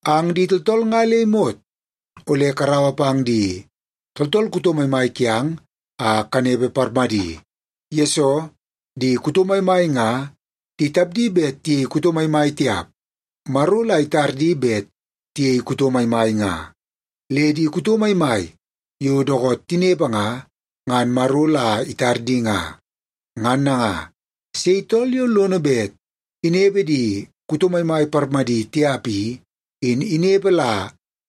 Ang di tooltool nga le imot ole karaua pang di tooltool kuto maimai kiang a kanepe parmadi. Yesoo, di kuto maimai nga di tapdi bet tiyei kuto maimai tiap, Maro la itar di bet tiyei kuto maimai nga. Le di kuto maimai yo dookoot tinepe nga, ngan Maro la itar di nga. Ngan nanga, sei tool yo lono bet inepe di kuto maimai parmadi tiap i, in inepe la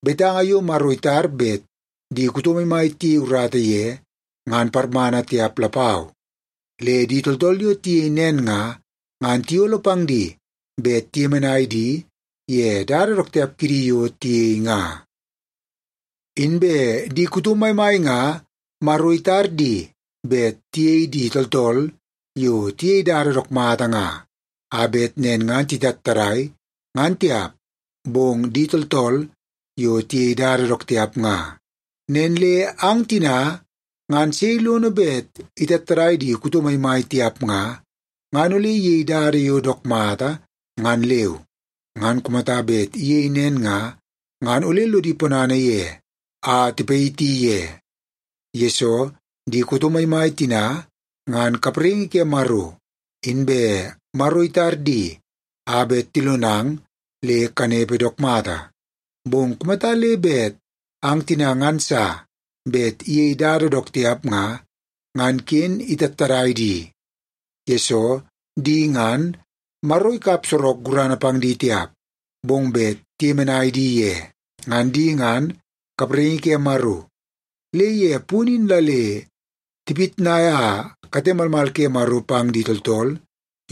betanga yo Maro itar bet di kuto maimai tiyei urata ye ngan parmana tiap lapau. Le di tooltool yo tiyei nen nga, ngan tiyolo pang di bet tiyemenai di ye dada dook tiap kidi yo tiyei nga. Inbe di kuto maimai nga Maro itar di bet tiyei di tooltool yo tiyei dada dook mata nga, a bet nen ngan titattadai, ngan tiap, bong di tooltool yo tiyei dada dook tiap nga. Nen le ang tina nga sei lono bet itattadai di kuto maimai tiap nga, ngan ole iyei dada yo dook mata ngan leu. Ngan kumata bet iyei nen nga, ngan ole lodi ponana ye a tipayiti ye. Yesoo, di kuto maimai tina ngan kapraingi ke Maro. Inbe Maro itar di a bet tilonang le kanepe dook mata. Bong kumata le bet ang tina ngan sa bet iyei dada dook tiap nga, ngan ken itattadai di, yesoo di ngan, Maro ikap sorok gurana pang di tiap, bong bet tiyemenai di ye. Ngan di ngan kapraingi ke Maro, le ye punu in la le tipitnaia kate malmal ke Maro pang di tooltool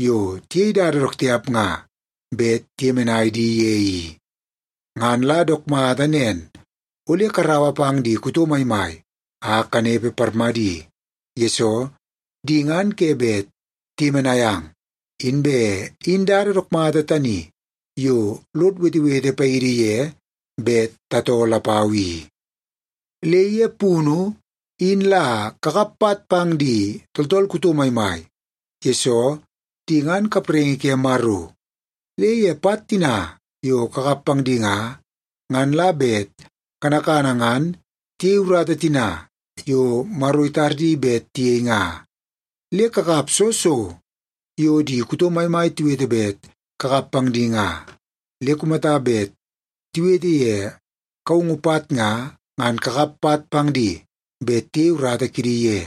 yo tiyei dada dook tiap nga bet tiyemenai di ye i. Ngan la dook mata nen, ole karaua pang di kuto maimai a kanepe parmadi, yesoo di ngan ke bet tiyemenai ang, inbe in dada dook mata tani yo lod wetewete paidi ye bet tatoo lapau i. Le ye punu, in la kakap pat pang di tooltool kuto maimai, yesoo di ngan kapraingi ke Maro. Le ye pat tina yo kakap pang di nga, ngan la bet kanakana ngan tiyei urata tina yo Maro itar di bet tiyei nga. Le kakap soo so yo di kuto maimai tiwete bet kakap pang di nga. Le kumata bet tiwete ye kaungu pat nga, ngan kakap pat pang di bet tiyei urata kidi ye.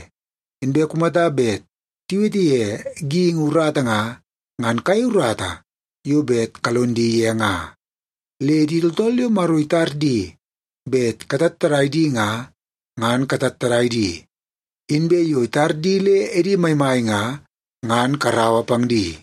Inbe kumata bet tiwete ye geingi urata nga, ngan kayei urata yo bet kalon di ye nga. Le di tooltool yo Maro itar di bet katattadai di nga, ngan katattadai di. Inbe yo itar di le edi maimai nga, ngan karaua pang di.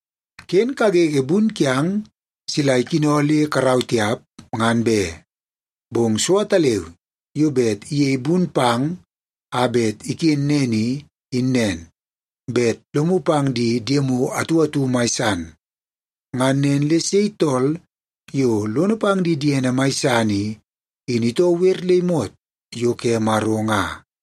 Ken kagege bun kiang sila ikino le karau tiap, ngan be. Bong so ataleu yo bet iyei ben bun pang a bet iken nen i, in nen; bet lomu pang di diemu atu atu mai san. Ngan nen le sei tool yo lono pang di diene mai san i, in itoo wer le imot yo ke Maro nga.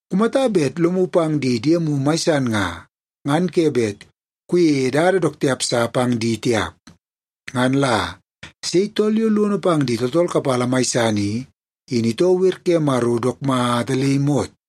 Kumata bet lomu pang di diemu mai san nga, ngan ke bet kuyei dada dook tiap sa pang di tiap. Ngan la sei tool yo lono pang di tooltool kapala mai san i, in itoo wer ke Maro dook mata le imot.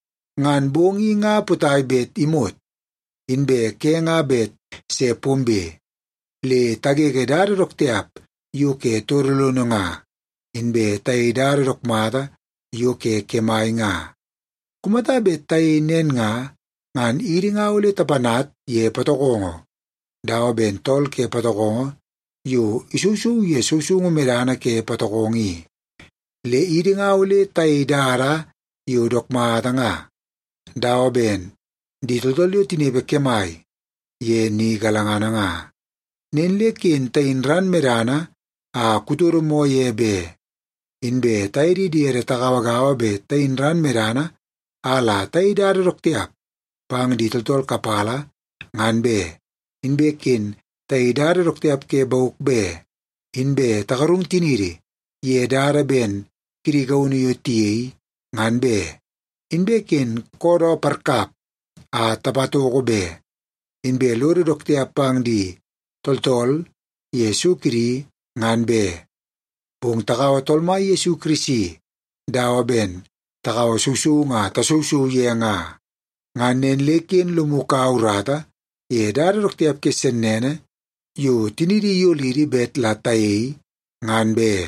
Ngan bong i nga potai bet imot, inbe ke nga bet se pombe. Le tagege dada dook tiap yo ke todo lono nga, inbe tayei dada dook mata yo ke kemai nga. Kumata bet tayei nen nga, ngan idi nga ole tapanat ye patokongo dawa ben tool ke patokongo yo isousou ye sousoungu medana ke patokongo i. Le idi nga ole tayei dada yo dook mata nga, dawa ben di tooltool yo tinepe kemai ye ni galangana nga. Nen le ken tayin ran medana a kutodo moo ye be, inbe taye di diede tagaua bet tayin ran medana a la tayei dada dook tiap pang di tooltool kapala, ngan be. Inbe ken tayei dada dook tiap ke bauk be, inbe tagarung tiniidi ye dada ben kidi gaunu yo tiyei, ngan be. Inbe ken koodoo parkap a tapatoko be, inbe lodo dook tiap pang di tooltool ye so kidi, ngan be. Bong takaua Tool Mai Yesu Kirisi dawa ben takaua sousoungu a tasousou ye nga. Ngan nen le ken lomu kaua urata ye dada dook tiap ke sennene yo tiniidi iyolidi bet la tayei, ngan be.